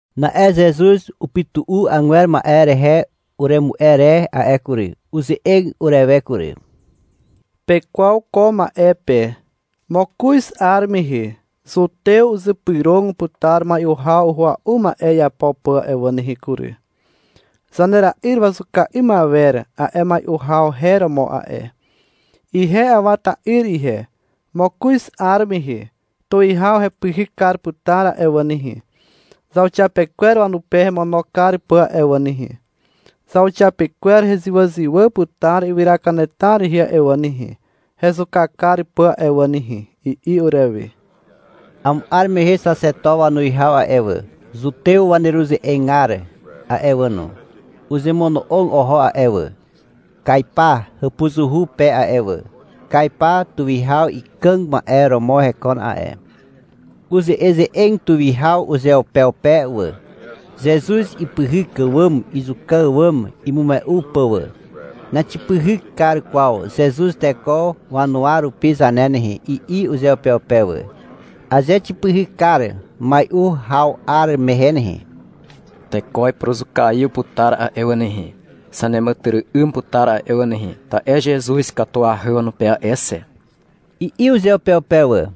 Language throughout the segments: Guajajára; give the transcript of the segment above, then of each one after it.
Na'e Zezuz upytu'u agwer ma'e rehe uremu'e re a'e kury. Uze'eg urewe kury. — Pekwaw ko ma'e pe. Mokoz 'ar mehe, Zutew uzypyrog putar mai'u haw uhua'u ma'e iapo pà a'e wà nehe kury. Zanera'yr wazuka 'ym awer a'e mai'u haw her romo a'e. Ihe Awa ta'yr ihe, mokoz 'ar mehe tuwihaw hepyhyk kar putar a'e wà nehe, zauxiapekwer wanupe hemono kar pà a'e wà nehe. Zauxiapekwer hezywàzywà putar ywyra kanetar rehe a'e wà nehe, hezuka kar pà a'e wà nehe, i'i urewe. Amo 'ar mehe xaxeto wanuwihaw a'e wà, Zutew waneruze'egar a'e wà no, uzemono'og oho a'e wà, Kaipa hàpuzuhu pe a'e wà. Kaipa tuwihaw ikàg ma'e romo hekon a'e. Uze'eze'eg tuwihaw uzeupeupe wà, Zezuz ipyhyk àwàm izuka àwàm imume'u pà wà. — Naxipyhyk kar kwaw Zezuz teko wanuwa rupi zane nehe, i'i uzeupeupe wà. — Aze xipyhyk kar mai'u haw 'ar mehe nehe, teko ipuruzukaiw putar a'e wà nehe, Zaneàmàtyry'ym putar a'e wà nehe, ta'e Zezuz ikatuahy wanupe a'e xe, i'i uzeupeupe wà.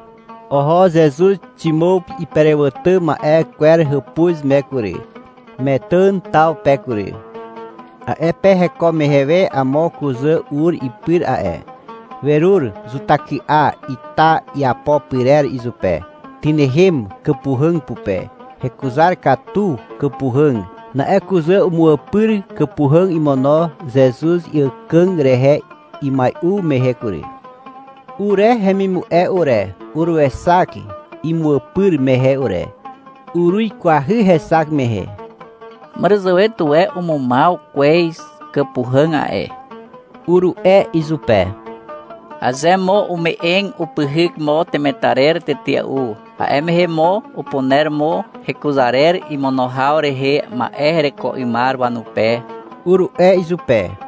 Oho Zezuz Ximàw iperewàtà ma'e kwer hàpuz me kury, Metàn taw pe kury. A'e pe heko mehe we amo kuzà ur ipyr a'e. Werur zutahyky'a ita iapo pyrer izupe. Tynehem kàpuhàg pupe. Hekuzar katu kàpuhàg. Na'e kuzà umu'àpyr kàpuhàg imono Zezuz iàkàg rehe imai'u mehe kury. Ure hemimu'e ure, uruexak imu'àpyr mehe ure. Uruikwahy hexak mehe. — Màràzàwe tuwe umumaw kwez kàpuhàg a'e, uru'e izupe. — Aze mo ume'eg, upyhyk mo temetarer tetea'u, a'e mehe mo upuner mo hekuzarer imono haw rehe ma'e hereko 'ymar wanupe, uru'e izupe.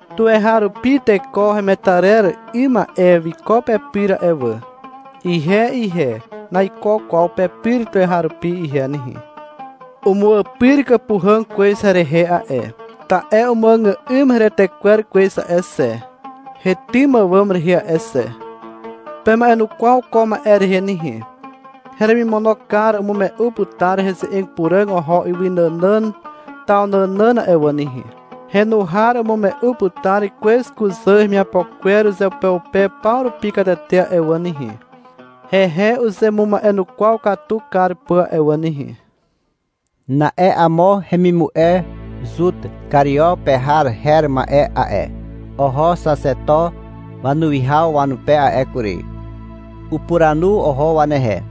Tuweharupi teko hemetarer 'ym ma'e wiko pepyr a'e wà. Ihe ihe, naiko kwaw pepyr tuweharupi ihe nehe. Umu'àpyr kàpuhàg kwez herehe a'e, ta'e umuàgà'ym heretekwer kwez a'e xe, hetym àwàm rehe a'e xe. Pema'enukwaw ko ma'e rehe nehe. Heremimono kar umume'u putar ze'eg puràg oho ywy nànàn taw nànàn a'e wà nehe. Henu har umume'u putar kwez kuzà hemiapo kwer uzeupeupe paw rupi katete a'e wà nehe, hehe uzemuma'enukwaw katu kar pà a'e wà nehe. Na'e amo hemimu'e Zut Kario pe har her ma'e a'e, oho xaxeto wanuwihaw wanupe a'e kury. Upuranu oho wanehe.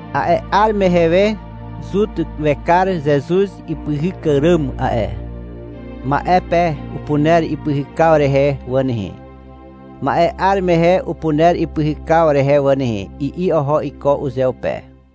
A'e 'ar mehe we Zut wekar Zezuz ipyhyk àràm a'e. — Ma'e pe upuner ipyhykaw rehe wà nehe. Ma'e 'ar mehe upuner ipyhykaw rehe wà nehe, i'i oho iko uzeupe.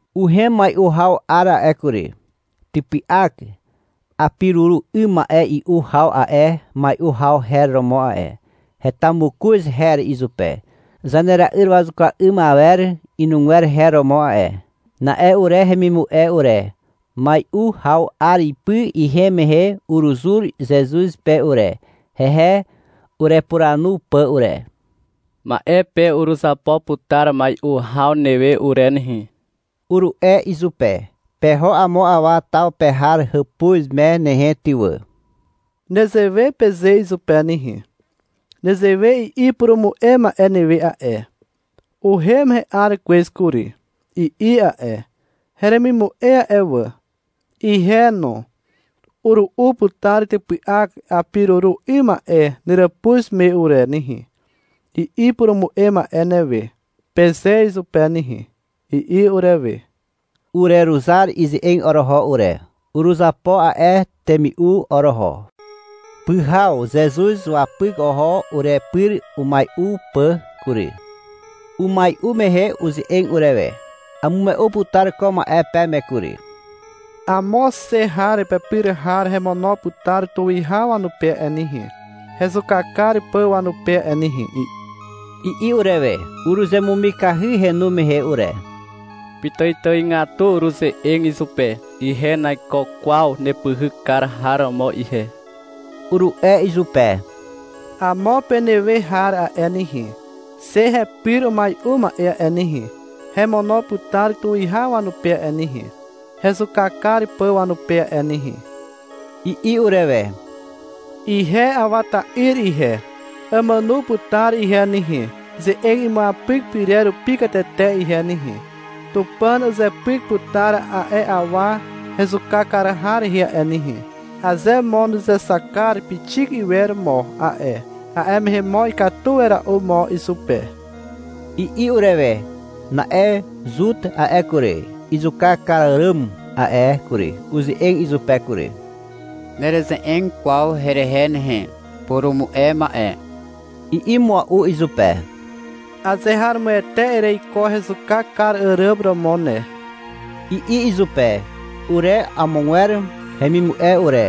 Uhem mai'u haw 'ar a'e kury. Typy'ak apiruru 'ym ma'e i'u haw a'e mai'u haw her romo a'e. Heta mokoz her izupe. Zanera'yr wazuka 'ym awer inugwer her romo a'e. Na'e ure hemimu'e ure, mai'u haw 'ar ipy ihem mehe uruzur Zezuz pe ure, hehe urepuranu pà ure. — Ma'e pe uruzapo putar mai'u haw newe ure nehe, uru'e izupe. — Peho amo awa taw pe har hàpuz me nehe ty wà. Nezewe peze izupe nehe. — Nezewe i'i purumu'e ma'e newe a'e. — Uhem he'ar kwez kury, i'i a'e. — Heremimu'e a'e wà, ihe no, uru'u putar typy'ak apiruru 'ym ma'e neràpuz me ure nehe, i'i upurumu'e ma'e newe, peze izupe nehe, i'i urewe. Ureruzar ize'eg oroho ure. Uruzapo a'e temi'u oroho. Pyhaw Zezuz wapyk oho urepyr umai'u pà kury. Umai'u mehe uze'eg urewe. — Amume'u putar ko ma'e peme kury. Amo xe har pepyr har hemono putar tuwihaw wanupe a'e nehe, hezuka kar pà wanupe a'e nehe, i'i urewe. Uruzemumikahy henu mehe ure. Pitàitàigatu uruze'eg izupe. — Ihe naiko kwaw nepyhyk kar har romo ihe, uru'e izupe — Amo penehe we har a'e nehe, xe hepyr umai'u ma'e a'e nehe, hemono putar tuwihaw wanupe a'e nehe, hezuka kar pà wanupe a'e nehe, i'i urewe. — Ihe Awa ta'yr ihe, amàno putar ihe nehe, ze'eg imuapyk pyrer rupi katete ihe nehe. Tupàn uzepyk putar a'e awa hezuka kar har rehe a'e nehe. Aze mo nuzexak kar pixik iwer mo a'e, a'e mehe mo ikatu wera'u mo izupe, i'i urewe. Na'e Zut a'e kury, izuka kar àràm a'e kury, uze'eg izupe kury. — Nereze'eg kwaw herehe ne, purumu'e ma'e, i'i mua'u izupe. — Azeharomoete ereiko hezuka kar àràm romo ne, i'i izupe. (Ure amogwer hemimu'e ure,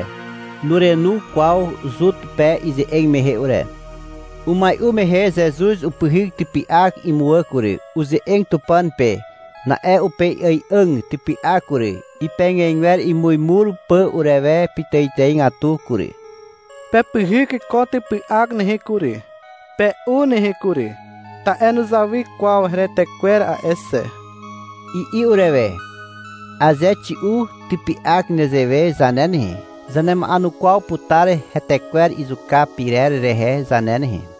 nurenu kwaw Zut pe ize'eg mehe ure.) Umai'u mehe Zezuz upyhyk typy'ak imuwà kury. Uze'eg Tupàn pe. Na'e upei'ài'àg typy'ak kury, ipegegwer imuimur pà urewe pitàitàigatu kury. Pepyhyk ko typy'ak nehe kury, pe'u nehe kury, ta'e nuzawy kwaw heretekwer a'e xe, i'i urewe. (Aze xi'u typy'ak nezewe zane nehe, zanema'enukwaw putar hetekwer izuka pyrer rehe zane nehe.)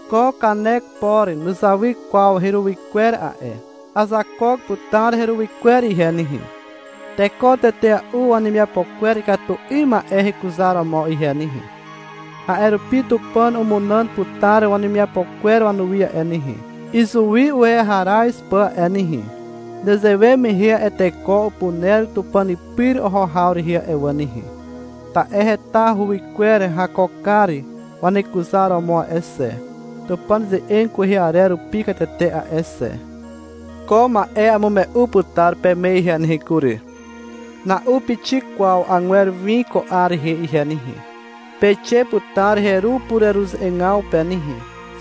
Ko kanek por nuzawy kwaw heruwy kwer a'e. Azakook putar heruwy kwer ihe nehe, teko tetea'u wanemiapo kwer ikatu 'ym ma'e hekuzaromo ihe nehe. A'e rupi Tupàn umunàn putar wanemiapo kwer wanuwi a'e nehe, izuwi uweharaz pà a'e nehe. Nezewe mehe a'e teko upuner Tupàn pyr oho haw rehe a'e wà nehe, ta'e heta uwy kwer hakookar wanekuzaromo a'e xe, Tupàn ze'eg kwehe arer rupi katete a'e xe. Ko ma'e amume'u putar peme ihe nehe kury. Na'u pixik kwaw agwer win ko 'ar rehe ihe nehe. Peixe putar heru pureruze'egaw pe nehe,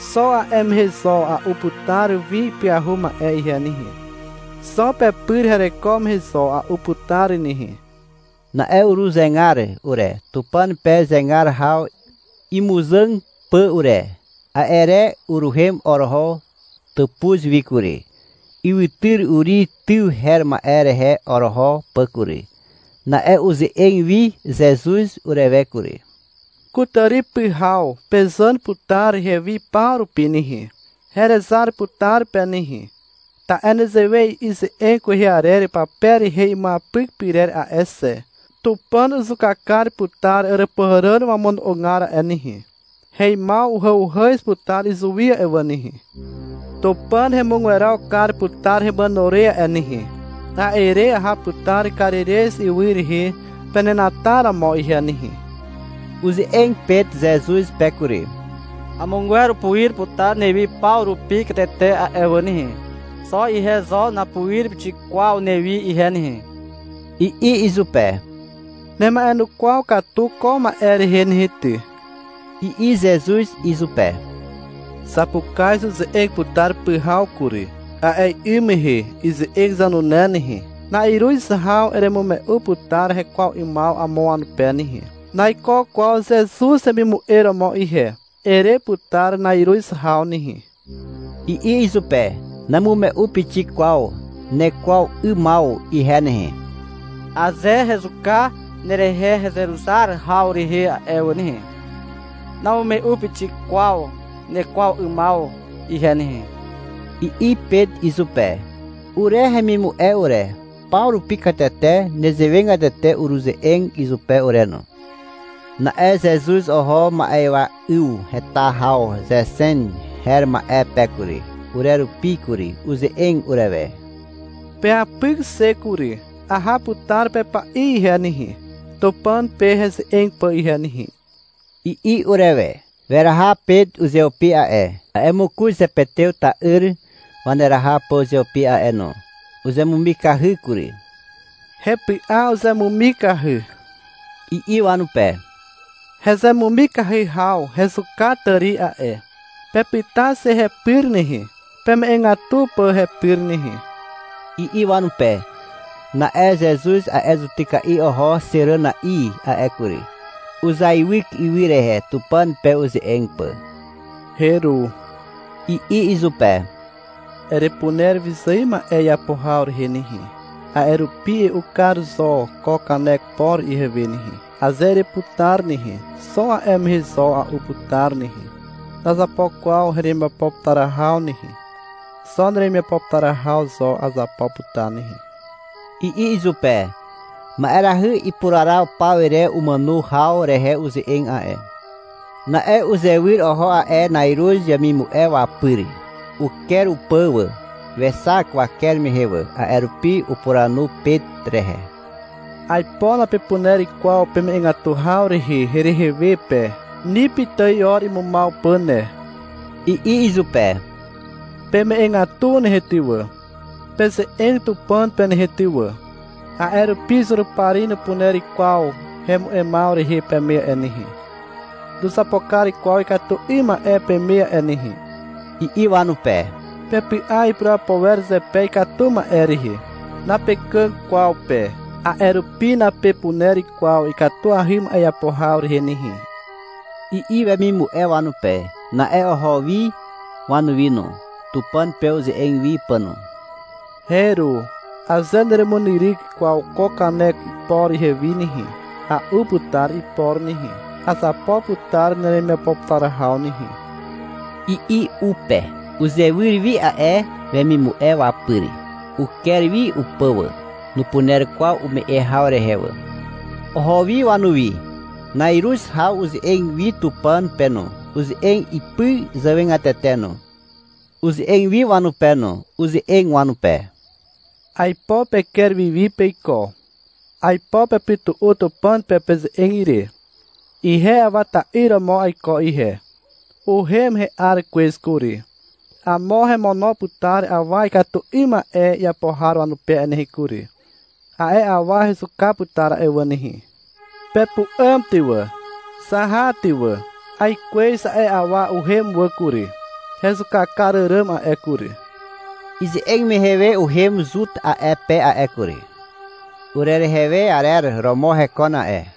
xo a'e mehe zo a'u putar win ipyahu ma'e ihe nehe, xo pepyr hereko mehe zo a'u putar nehe. Na'e uruzegar ure, Tupàn pe zegar haw imuzàg pà ure. A'e re uruhem oroho tàpuz wi kury, ywytyr Uri tyw her ma'e rehe oroho pà kury. Na'e uze'eg wi Zezuz urewe kury. — Kutàri pyhaw pezàn putar hewi paw rupi nehe, herezar putar pe nehe. Ta'e nezewe i'i ze'eg kwehe arer pape rehe imuapyk pyrer a'e xe. Tupàn uzuka kar putar àràpuhàràn wamono'ogar a'e nehe. Heimaw uhàuhàz putar izuwi a'e wà nehe. Tupàn hemugweraw kar putar hemàno re a'e nehe. A'e re aha putar Karirez ywy rehe penenataromo ihe nehe. Uze'eg Pet Zezuz pe kury. — Amogwer upuir putar newi paw rupi katete a'e wà nehe. Xo ihe zo napuir pixik kwaw newi ihe nehe, i'i izupe. — Nema'enukwaw katu ko ma'e rehe nehe ty, i'i Zezuz izupe. — Zapukaz uze'eg putar pyhaw kury. A'e 'ym mehe, ize'eg zanune nehe, na'iruz haw eremume'u putar hekwaw 'ymaw amo wanupe nehe. — Naiko kwaw Zezuz hemimu'e romo ihe, ere putar na'iruz haw nehe, i'i izupe. — Namume'u pixik kwaw nekwaw 'ymaw ihe nehe. Aze hezuka nerehe hezeruzar haw rehe a'e wà nehe, namume'u pixik kwaw nekwaw 'ymaw ihe nehe, i'i Pet izupe. Ure hemimu'e ure, paw rupi katete nezewegatete uruze'eg izupe ure no. Na'e Zezuz oho ma'ywa 'yw heta haw Zexem her ma'e pe kury, urerupi kury. Uze'eg urewe. — Peapyk xe kury. Aha putar pepa'i ihe nehe, Tupàn pe heze'eg pà ihe nehe, i'i urewe. Weraha Pet uzeupi a'e, a'e mokoz Zepetew ta'yr waneraha pà uzeupi a'e no. Uzemumikahy kury. — Hepy'a uzemumikahy, i'i wanupe. — Hezemumikahy haw hezuka tàri a'e. Pepyta xe hepyr nehe, peme'egatu pà hepyr nehe, i'i wanupe. Na'e Zezuz a'e zutyka'i oho xeràna'i a'e kury. Uzeaiwyk ywy rehe Tupàn pe uze'eg pà. — Heru, i'i izupe. — Erepuner wyzài ma'e iapo haw rehe nehe. A'e rupi e'u kar zo ko kanek por ihewe nehe. Aze ereputar nehe, xo a'e mehe zo a'u putar nehe. Nazapo kwaw heremiapo putar haw nehe. Xo neremiapo putar haw zo azapo putar nehe, i'i izupe. (Ma'erahy ipuraraw paw rehe umàno haw rehe uze'eg a'e.) Na'e uzewyr oho a'e na'iruz wemimu'e wapyr. Uker upà wà. Wexak waker mehe wà. A'e rupi upuranu Pet rehe. — Aipo napepuner kwaw peme'egatu haw rehe herehe we pe. Ni pitài 'or imumaw pà ne, i'i izupe. — Peme'egatu nehe ty wà, peze'eg Tupàn pe nehe ty wà, a'e rupi Zurupari nupuner kwaw hemu'emaw rehe peme a'e nehe, nuzapo kar kwaw ikatu 'ym ma'e peme a'e nehe, i'i wanupe. — Pepy'a ipurapo wer zepe ikatu ma'e rehe. Napekàg kwaw pe. A'e rupi napepuner kwaw ikatuahy ma'e iapo haw rehe nehe, i'i wemimu'e wanupe. Na'e oho wi wanuwi no, Tupàn pe uze'eg wi pà no. — Heru. Aze neremunyryk kwaw ko kanek por ihewi nehe, a'u putar ipor nehe. Azapo putar neremiapo putar haw nehe, i'i u pe. Uzewyr wi a'e wemimu'e wapyr. Uker wi upà wà. Nupuner kwaw ume'e haw rehe wà. Oho wi wanuwi. Na'iruz haw uze'eg wi Tupàn pe no, uze'eg ipy zàwegatete no. Uzewyr wi wanupe no. Uze'eg wanupe. — Aipo peker wiwi peiko. Aipo pepytu'u Tupàn pe peze'eg ire. Ihe Awa ta'yr romo aiko ihe. Uhem he'ar kwez kury. Amo hemono putar awa ikatu 'ym ma'e iapo har wanupe a'e nehe kury. A'e awa hezuka putar a'e wà nehe. Pepu'àm ty wà, zaha ty wà. Aikwez a'e awa uhem wà kury, hezuka kar àràm a'e kury. Ize'eg mehe we uhem Zut a'e pe a'e kury. Urerehe we arer romo hekon a'e.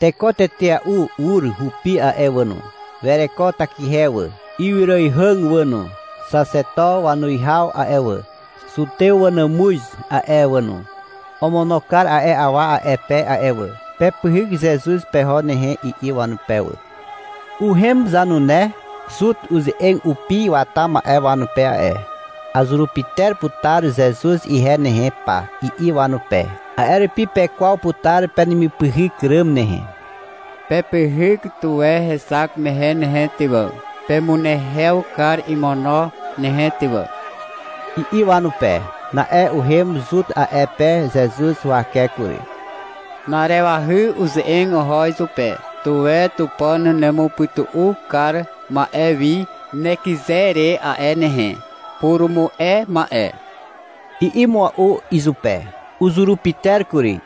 Teko tetea'u ur hupi a'e wà no. Wereko takihe wà, ywyraihàg wà no. Xaxeto wanuwihaw a'e wà, Zutew wanàmuz a'e wà no, omono kar a'e awa a'e pe a'e wà. — Pepyhyk Zezuz peho nehe, i'i wanupe wà. Uhem zanune Zut uze'eg upi wata ma'e wanupe a'e. — Azurupyter putar Zezuz ihe nehe pa, i'i wanupe. — A'e rupi pekwaw putar penemipyhyk ràm nehe. Pepyhyk tuwe hexak mehe nehe ty wà. Pemunehew kar imono nehe ty wà, i'i wanupe. Na'e uhem Zut a'e pe Zezuz huwake kury. Na'arewahy uze'eg oho izupe. — Tuwe Tupàn nemupytu'u kar ma'e wi nekyze re a'e nehe, purumu'e ma'e, i'i mua'u izupe. Uzurupyter kury.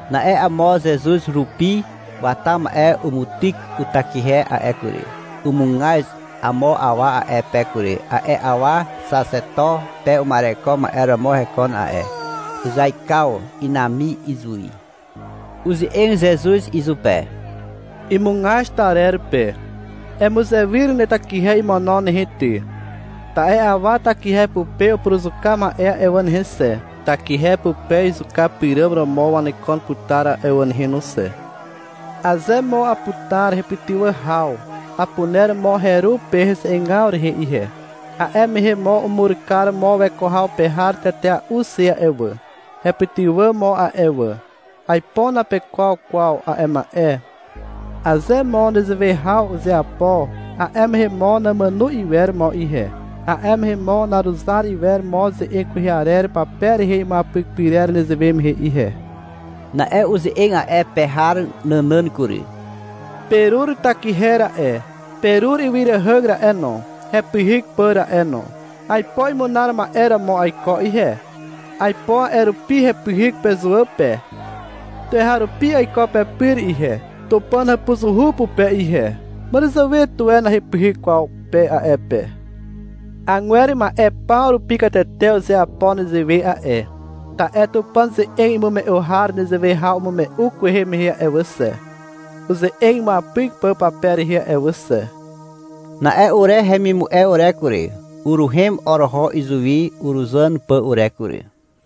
Na'e amo Zezuz rupi wata ma'e umutyk utakihe a'e kury. Umugaz amo awa a'e pe kury. A'e awa xaxeto pe uma'ereko ma'e romo hekon a'e. Uzaikaw inami izuwi. Uze'eg Zezuz izupe, imugaz tarer pe. — Emuzewyr netakihe imono nehe ty. Ta'e awa takihe pupe upuruzuka ma'e a'e wà nehe xe, takihe pupe izuka pyràm romo wanekon putar a'e wà nehe no xe. Aze mo aputar hepytywà haw, apuner mo heru pe heze'egaw rehe ihe. A'e mehe mo umur kar mo weko haw pe har tetea'u xe a'e wà. Hepytywà mo a'e wà. Aipo napekwaw kwaw a'e ma'e. Aze mo nezewe haw uzeapo, a'e mehe mo namàno iwer mo ihe. A'e mehe mo naruzar iwer mo ze'eg kwehe arer pape rehe imuapyk pyrer nezewe mehe ihe. Na'e uze'eg a'e pe har nànàn kury. — Perur takihe ra'e, perur ywyràihàg ra'e no, hepyhyk pà ra'e no. Aipo imunar ma'e romo aiko ihe. Aipo a'e rupi hepyhyk pezuwà pe. Tuweharupi aiko pepyr ihe, Tupàn hàpuzuhu pupe ihe. Màràzàwe tuwe nahepyhyk kwaw pe a'e pe. Agwer ma'e paw rupi katete uzeapo nezewe a'e, ta'e Tupàn ze'eg imume'u har nezewe haw umume'u kwehe mehe a'e wà xe, uze'eg imuapyk pà pape rehe a'e wà xe. Na'e ure hemimu'e ure kury, uruhem oroho izuwi uruzàn pà ure kury.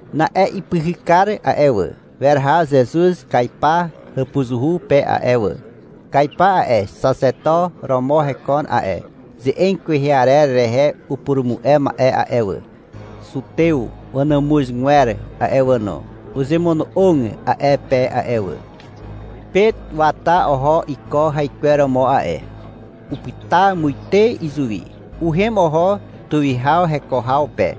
Na'e ipyhykar a'e wà, weraha Zezuz Kaipa hàpuzuhu pe a'e wà. Kaipa a'e, xaxeto romo hekon a'e. Ze'eg kwehe arer rehe upurumu'e ma'e a'e wà, Zutew wanàmuzgwer a'e wà no, uzemono'og a'e pe a'e wà. Pet wata oho iko haikweromo a'e. Upyta muite izuwi. Uhem oho tuwihaw heko haw pe.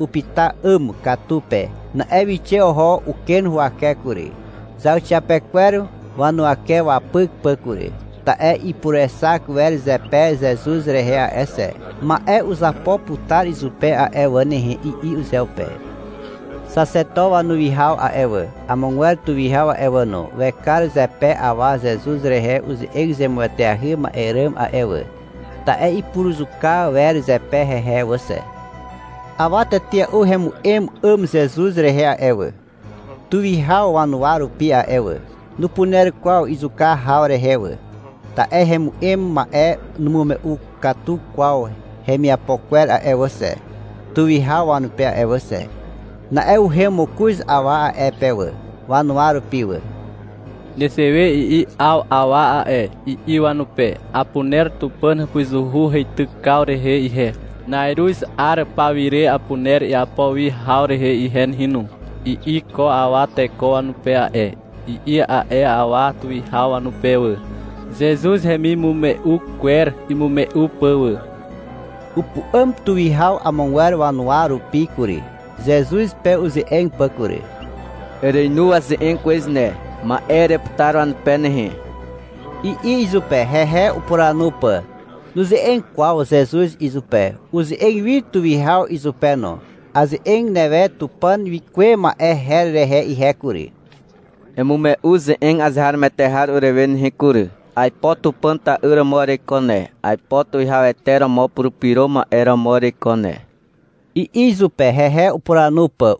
Upyta 'àm katu pe. Na'e wixe oho uken huwake kury, zauxiapekwer wanuwake wapyk pà kury. Ta'e ipurexak wer zepe Zezuz rehe a'e xe. — Ma'e uzapo putar izupe a'e wà nehe, i'i uzeupe. Xaxeto wanuwihaw a'e wà, amogwer tuwihaw a'e wà no, wekar zepe awa Zezuz rehe uze'eg zemueteahy ma'e ràm a'e wà. Ta'e ipuruzuka wer zepe hehe wà xe. Awa tetea'u hemu'em 'àm Zezuz rehe a'e wà, tuwihaw wanuwa rupi a'e wà. Nupuner kwaw izuka haw rehe wà, ta'e hemu'em ma'e numume'u katu kwaw hemiapo kwer a'e wà xe, tuwihaw wanupe a'e wà xe. Na'e uhem mokoz awa a'e pe wà, wanuwa rupi wà. — Nezewe i'i 'aw awa a'e, i'i wanupe. — Apuner Tupàn hàpuzuhu heitykaw rehe ihe. Na'iruz 'ar pawire apuner iapo wi haw rehe ihe nehe no, i'i ko awa teko wanupe a'e, i'i a'e awa tuwihaw wanupe wà, Zezuz hemimume'u kwer imume'u pà wà. Upu'àm tuwihaw amogwer wanuwa rupi kury, Zezuz pe uze'eg pà kury. — Ereinu waze'eg kwez ne. Ma'e ere putar wanupe nehe, i'i izupe, hehe upuranu pà. Nuze'eg kwaw Zezuz izupe. Uze'eg wi tuwihaw izupe no. — Aze'eg newe Tupàn wikuwe ma'e her rehe ihe kury. Emume'u ze'eg azeharomoete har urewe nehe kury. Aipo Tupàn ta'yr romo ereiko ne. Aipo Tuwihawete romo Purupyro Ma'e romo ereiko ne, i'i izupe, hehe upuranu pà.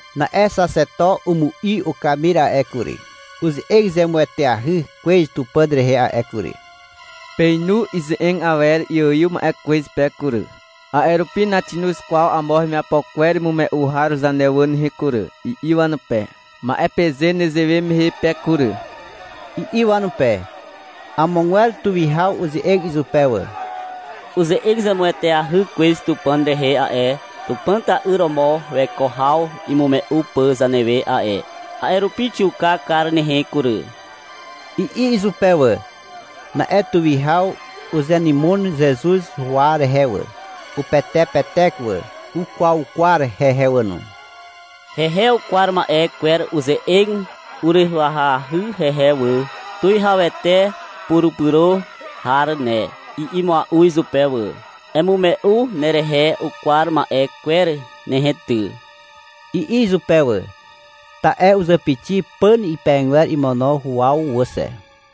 Na'e xaxeto umu'i ukamir a'e kury. — Uze'eg zemueteahy kwez Tupàn rehe a'e kury, peinu ize'eg awer iaiw ma'e kwez pe kury. A'e rupi naxinoz kwaw amo hemiapo kwer imume'u har zane wà nehe kury, i'i wanupe. — Ma'e peze nezewe mehe pe kury, i'i wanupe. Amogwer tuwihaw uze'eg izupe wà. — Uze'eg zemueteahy kwez Tupàn rehe a'e, Tupàn ta'yr romo weko haw imume'u pà zanewe a'e. A'e rupi xiuka kar nehe kury, i'i izupe wà. Na'e tuwihaw uzenymon Zezuz huwa rehe wà. Upetepetek wà. Ukwaukwar hehe wà no. Hehe ukwar ma'e kwer uze'eg urywahyahy hehe wà. — Tuwihawete purupyro har ne, i'i mua'u izupe wà. — Emume'u nerehe ukwar ma'e kwer nehe ty, i'i izupe wà. (Ta'e uzàpixi pàn pehegwer imono huwaw wà xe.)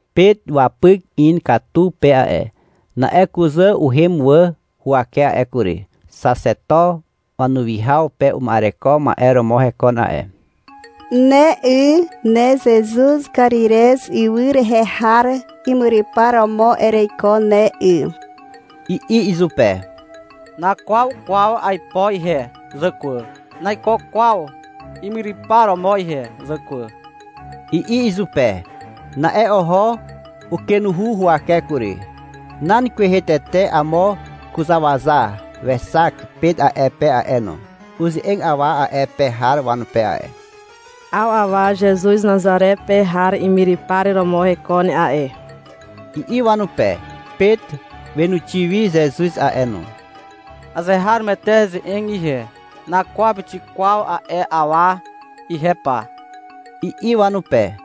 Pet wapyk in katu pe a'e. Na'e kuzà uhem wà huwake a'e kury. Xaxeto wanuwihaw pe uma'ereko ma'e romo hekon a'e. — Ne 'y, ne Zezuz Karirez ywy rehe har imyrypar romo ereiko ne 'y, i'i izupe. — Nakwaw kwaw aipo ihe, zàkwà. Naiko kwaw imyrypar romo ihe, zàkwà, i'i izupe. Na'e oho ukenuhu huwake kury. Nan kwehe tete amo kuzàwaza wexak Pet a'e pe a'e no. Uze'eg awa a'e pe har wanupe a'e. — 'Aw awa Zezuz Nazare pe har imyrypar romo hekon a'e, i'i wanupe. Pet wenuxi wi Zezuz a'e no. — Azeharomoete heze'eg ihe. Nakwaw pixik kwaw a'e awa ihe pa, i'i wanupe.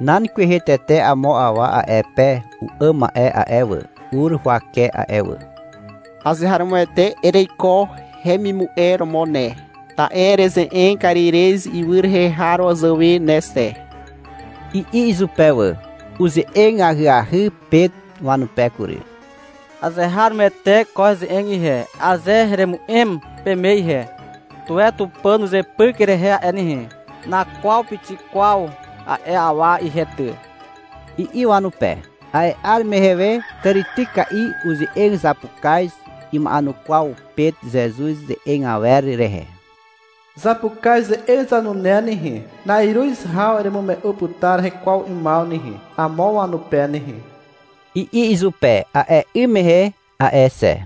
Nan kwehe tete amo awa a'e pe u'àm ma'e a'e wà, ur huwake a'e wà. — Azeharomoete ereiko hemimu'e romo ne, ta'e ereze'eg Karirez ywy rehe har wazàwe ne xe, i'i izupe wà. Uze'eg ahyahy Pet wanupe kury. — Azeharomoete ko heze'eg ihe. Aze heremu'em peme ihe, tuwe Tupàn uzepyk herehe a'e nehe. Nakwaw pixik kwaw a'e awa ihe ty, i'i wanupe. A'e 'ar mehe we tàrityka'i uze'eg zapukaz. Ima'enukwaw Pet Zezuz ze'eg awer rehe. — Zapukaz ze'eg zanune nehe, na'iruz haw eremume'u putar hekwaw 'ymaw nehe, amo wanupe nehe, i'i izupe a'e 'ym mehe a'e xe.